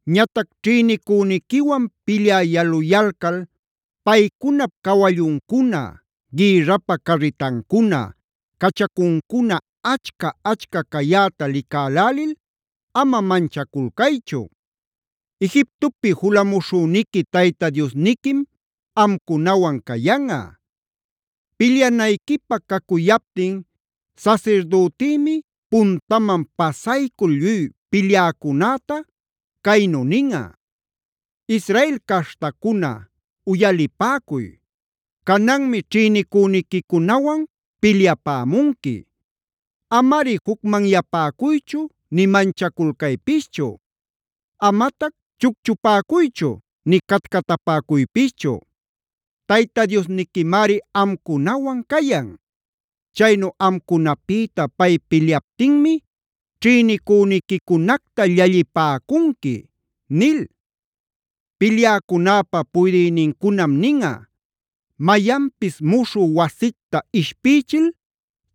“Ñatac ćhïnicüniquiwan pilyä yaluyalcal paycunap cawalluncuna, gïrrapä carritancuna, cachacuncuna achca-achca cayäta licälälil ama manchaculcaychu. Egiptopi julamuśhüniqui Tayta Diosniquim amcunawan cayanꞌa. Pilyanayquipä cacuyaptin sasirdütïmi puntaman pasaycul lluy pilyäcunäta, caynu ninꞌa: ‘Israel caśhtacuna uyalipäcuy. Cananmi ćhïnicüniquicunawan pilyapämunqui. Amari jucmanyapäcuychu, nï manchaculcaypischu. Amatac chucchupäcuychu, nï catcatapäcuypischu. Tayta Diosniquimari amcunawan cayan. Chaynu amcunapïta pay pilyaptinmi ćhïnicüniquicunacta llallipäcunqui’ nil. “Pilyäcunäpa puydïnincunam ninꞌa: ‘Mayanpis muśhü wasicta ishpïchil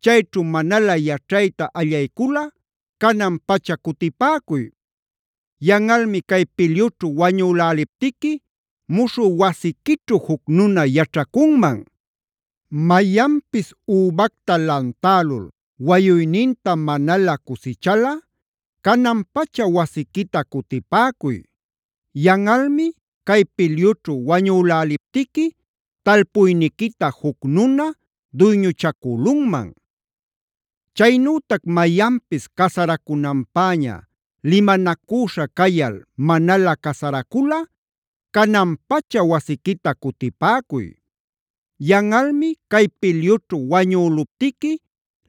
chayćhu manalä yaćhayta allayculꞌa canan-pacha cutipäcuy; yanꞌalmi cay pilyućhu wañüläliptiqui muśhü wasiquićhu juc nuna yaćhacunman. Mayanpis übacta lantälul wayuyninta manalä cusichalꞌa canan-pacha wasiquita cutipäcuy. Yanꞌalmi cay pilyućhu wañüläliptiqui talpuyniquita juc nuna duyñuchacülunman. Chaynütac mayanpis casaracunanpäña limanacüśha cayal manalä casaraculꞌa canan-pacha wasiquita cutipäcuy. Yanꞌalmi cay pilyućhu wañüluptiqui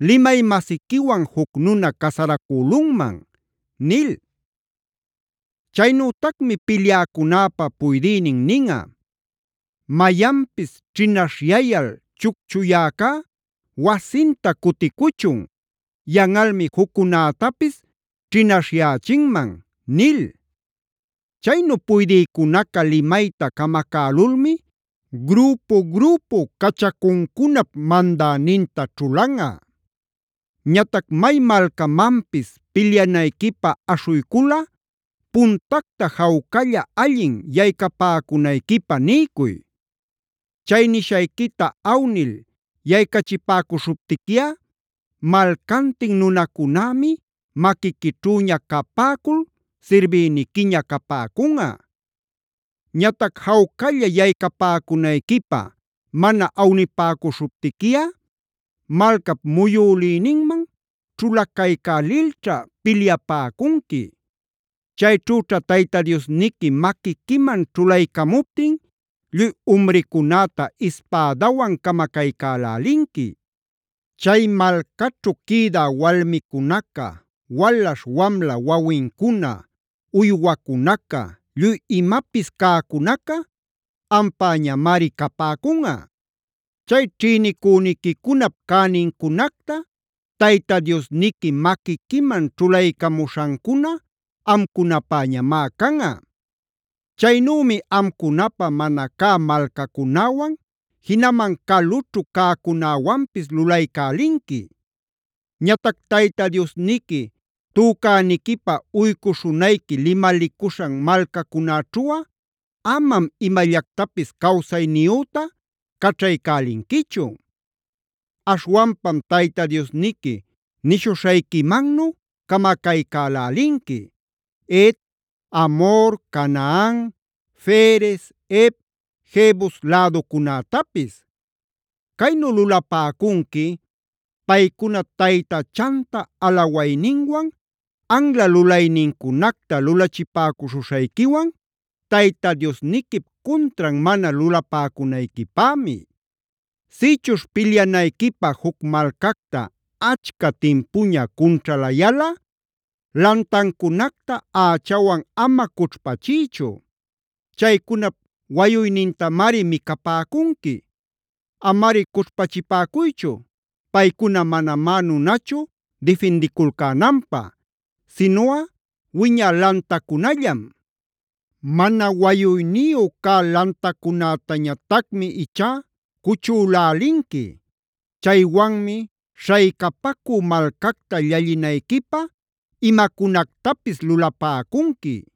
limay-masiquiwan juc nuna casaracülunman’ nil. “Chaynütacmi pilyäcunäpa puydïnin ninꞌa: ‘Mayanpis ćhinaśhyayal chucchuyäcá wasinta cuticuchun; yanꞌalmi juccunätapis ćhinaśhyächinman’ nil. Chaynu puydïcunaca limayta camacälulmi grüpu-grüpu cachacuncunap mandäninta ćhulanꞌa. “Ñatac may malcamanpis pilyanayquipä aśhuyculꞌa puntacta jawcalla allin yaycapäcunayquipä niycuy. Chay nishayquita awnil yaycachipäcuśhuptiquiꞌa malcantin nunacunämi maquiquićhüña capäcul sirbïniquiña capäcunꞌa. Ñatac jawcalla yaycapäcunayquipä mana awnipäcuśhuptiquiꞌa malcap muyülïninman ćhulacaycälilćha pilyapäcunqui. Chayćhüćha Tayta Diosniqui maquiquiman ćhulaycamuptin lluy umricunäta ispädawan camacaycälälinqui. Chay malcaćhu quïdä walmicunaca, walaśh wamla wawincuna, uywacunaca, lluy imapis cäcunaca ampäñamari capäcunꞌa. Chay ćhïnicüniquicunap cänincunacta Tayta Diosniqui maquiquiman ćhulaycamuśhancuna amcunapäñamá canꞌa. Chaynümi amcunapä mana cä malcacunäwan jinaman calućhu cäcunäwanpis lulaycälinqui. Ñatac Tayta Diosniqui tücäniquipä uycuśhunayqui limalicuśhan malcacunäćhuꞌa amam imallactapis cawsayniyüta caćhaycälinquichu. Aśhwanpam Tayta Diosniqui nishuśhayquimannu camacaycälälinqui Het, Amhor, Canaan, Ferez, Hev, Jebus läducunätapis. Caynu lulapäcunqui paycuna taytachanta alawayninwan anla lulaynincunacta lulachipäcuśhuśhayquiwan Tayta Diosniquip cuntran mana lulapäcunayquipämi.a “Sïchuśh pilyanayquipä juc malcacta achca timpuña cunćhalayalꞌa lantancunacta ächawan ama cućhpachiychu. Chaycunap wayuynintamari micapäcunqui. Amari cućhpachipäcuychu, paycuna manamá nunachu difindiculcänanpä; sinuꞌa wiñä lantacunallam. Mana wayuyniyu cä lantacunätañatacmi ichá cuchülälinqui. Chaywanmi śhaycapacü malcacta llallinayquipä imacunactapis lulapäcunqui.